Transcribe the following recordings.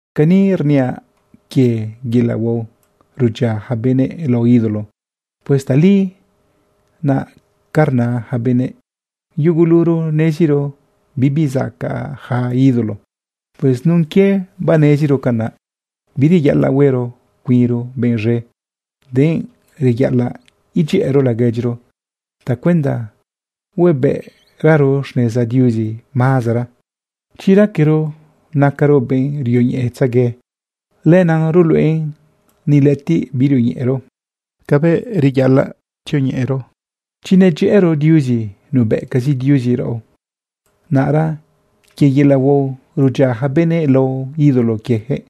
Ga ni rniaꞌ quie yelaꞌ huao rudyia yaca benëꞌ lao ídolo. Pues tali naꞌ ca rna yaca benëꞌ: Yuguluro neziro bibi zacaꞌ yaca ídolo. Pues nun quie baneziro canaꞌ, bireyaꞌalaꞌ huero cuinro benꞌ z̃e, denꞌ reyaꞌalaꞌ edyëꞌëro laguedyiro tacuenda huebëꞌraro xneza Diuzi mazera. Chi raquero nacaro benꞌ rioñeꞌetzegue, lenaꞌ ruluꞌen ni lëꞌëtiꞌ birioñeꞌero cabëꞌ reyaꞌalaꞌ tzioñeꞌero. Chi nedyëꞌëro Diuzi, nubëꞌcazi Diuzi raꞌo. Naꞌra quie yelaꞌ huao rudyia yaca benëꞌ lao ídolo quieyaquëꞌ,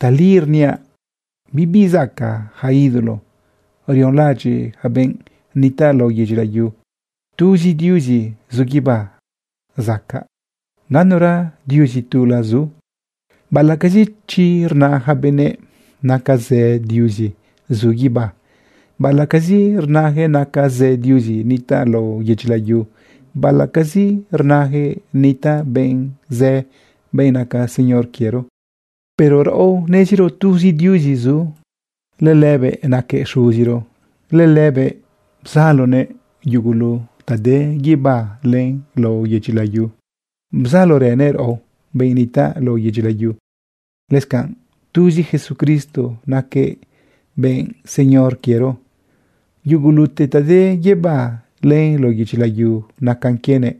tali rniaꞌ bibi zacaꞌ yaca ídolo rionlaꞌadyiꞌ yaca benꞌ nitaꞌ lao yedyi layu. Tuzi Diuzi zu guibá zacaꞌ, ganura diuzi tula zu. Baꞌalaꞌcazi chi rna yaca benëꞌ naca zë diuzi zu guibá, baꞌalaꞌcazi rnayaquëꞌ naca zë diuzi nitaꞌ lao yedyi layu, baꞌalaꞌcazi rnayaquëꞌ nitaꞌ benꞌ zë, benꞌ naca Señor quiero, pero raꞌo neziro tuzi Diuzi zu. Lëlëbëꞌ naquëꞌ Xuziro. Lëlëbëꞌ bzaloguëꞌ yugulu ta de guibá len lao yedyi layu. Bzalorënëꞌ raꞌo, benꞌ nitaꞌ lao yedyi layu. Lëscanꞌ tuzi Jesucristo naquëꞌ benꞌ Señor quiero. Yugulute ta de guibá len lao yedyi layu nacan quienëꞌ.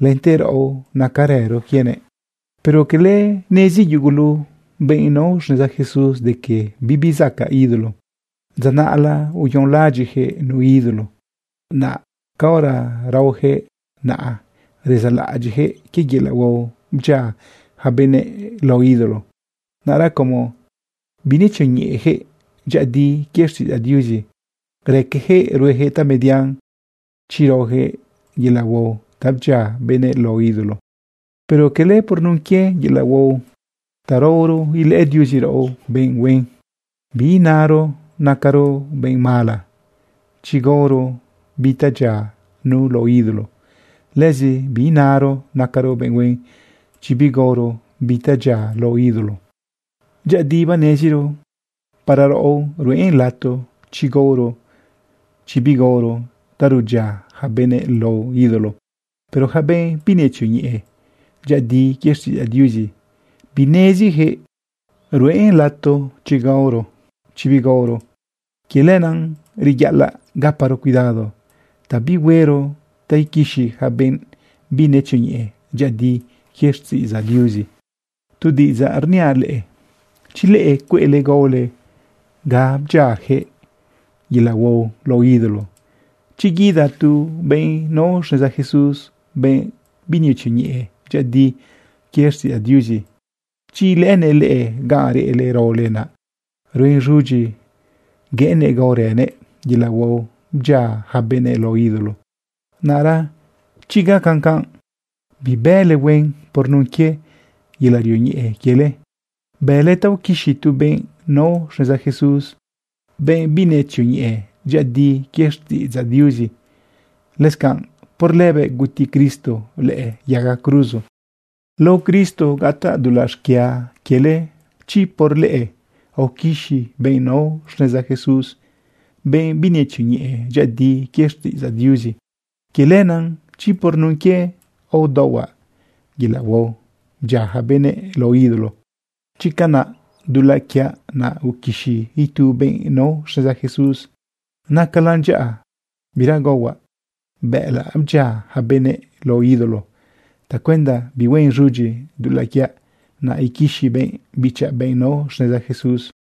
Lente raꞌo nacarëro quienëꞌ. Pero cala nezi yugulu benꞌ nao xneza Jesús de que bibi zacaꞌ ídolo. Dza naꞌla uyonlaꞌadyiꞌyaquëꞌ nu ídolo. Naꞌ caora raoyaquëꞌ naꞌa, rezaꞌlaꞌadyiꞌyaquëꞌ quie yelaꞌ huao bdyia yaca benëꞌ lao ídolo. Naꞌra como binetzioñeꞌeyaquëꞌ dyëꞌëdi quie xtiꞌidzaꞌ Diuzi, raqueyaquëꞌ rueyaquëꞌ tamedian chi raoyaquëꞌ yelaꞌ huao ta bdyia benëꞌ lao ídolo. Pero cala por nun quie yelaꞌ huao ta raoro ilëꞌë Diuzi raꞌo benꞌ huen. Biinaro nacaro benꞌ mala chi gaoro bi ta dyia nu lao ídolo. Lëzi binaro nacaro benꞌ huen chi bigaoro bi ta dyia lao ídolo. Dyëꞌëdi baneziro para raꞌo ruꞌen lato chi gaoro, chi bigaoro, ta rudyia yaca benëꞌ lao ídolo. Pero yaca benꞌ binetzioñeꞌe dyëꞌëdi quie xtiꞌidzaꞌ Diuzi, bineziyaquëꞌ ruꞌen lato chi gaoro, chi bigaoro. Quie lenaꞌ reyaꞌalaꞌ gaparo cuidado ta bihuero ta quixi yaca benꞌ binetzioñeꞌe dyëꞌëdi quie xtiꞌidzaꞌ Diuzi. Tu diꞌidzaꞌ rniaꞌ leꞌe. Chi leꞌe cueꞌle gaole ga bdyiayaquëꞌ yelaꞌ huao lao ídolo, chi guida tu benꞌ nao xneza Jesús, benꞌ binetzioñeꞌe dyëꞌëdi quie xtiꞌidzaꞌ Diuzi, chi ilëꞌënëꞌ leꞌe ganꞌ reꞌle raole, naꞌ ruen z̃udyi gueꞌennëꞌ gaorënëꞌ yelaꞌ huao bdyia yaca benëꞌ lao ídolo. Naꞌra chi gacan canꞌ, bibële huen. Por nun quie yelaꞌ rioñeꞌe quiele, bële ta uquixi tu benꞌ nao xneza Jesús, benꞌ binetzioñeꞌe dyëꞌëdi quie xtiꞌidzaꞌ Diuzi. Lëscanꞌ por lëbëꞌ guti Cristo lëꞌë yaga cruzo. Lao Cristo gataꞌ dulaꞌ xquia quiele chi por leꞌe aoquixi benꞌ nao xneza Jesús, benꞌ binetzioñeꞌe dyëꞌëdi quie xtiꞌidzaꞌ Diuzi. Quie lenaꞌ chi por nun quie udaohuaꞌ yelaꞌ huao bdyia yaca benëꞌ lao ídolo, chi canaꞌ dulaꞌ quiaꞌ naꞌ uquixi itu benꞌ nao xneza Jesús, nacalan dyaꞌa bira gaohuaꞌ bëꞌëlaꞌ bdyia yaca benëꞌ lao ídolo tacuenda bihuen z̃udyi dulaꞌ quiaꞌ naꞌ uquixi benꞌ bichaꞌ, benꞌ nao xneza Jesús.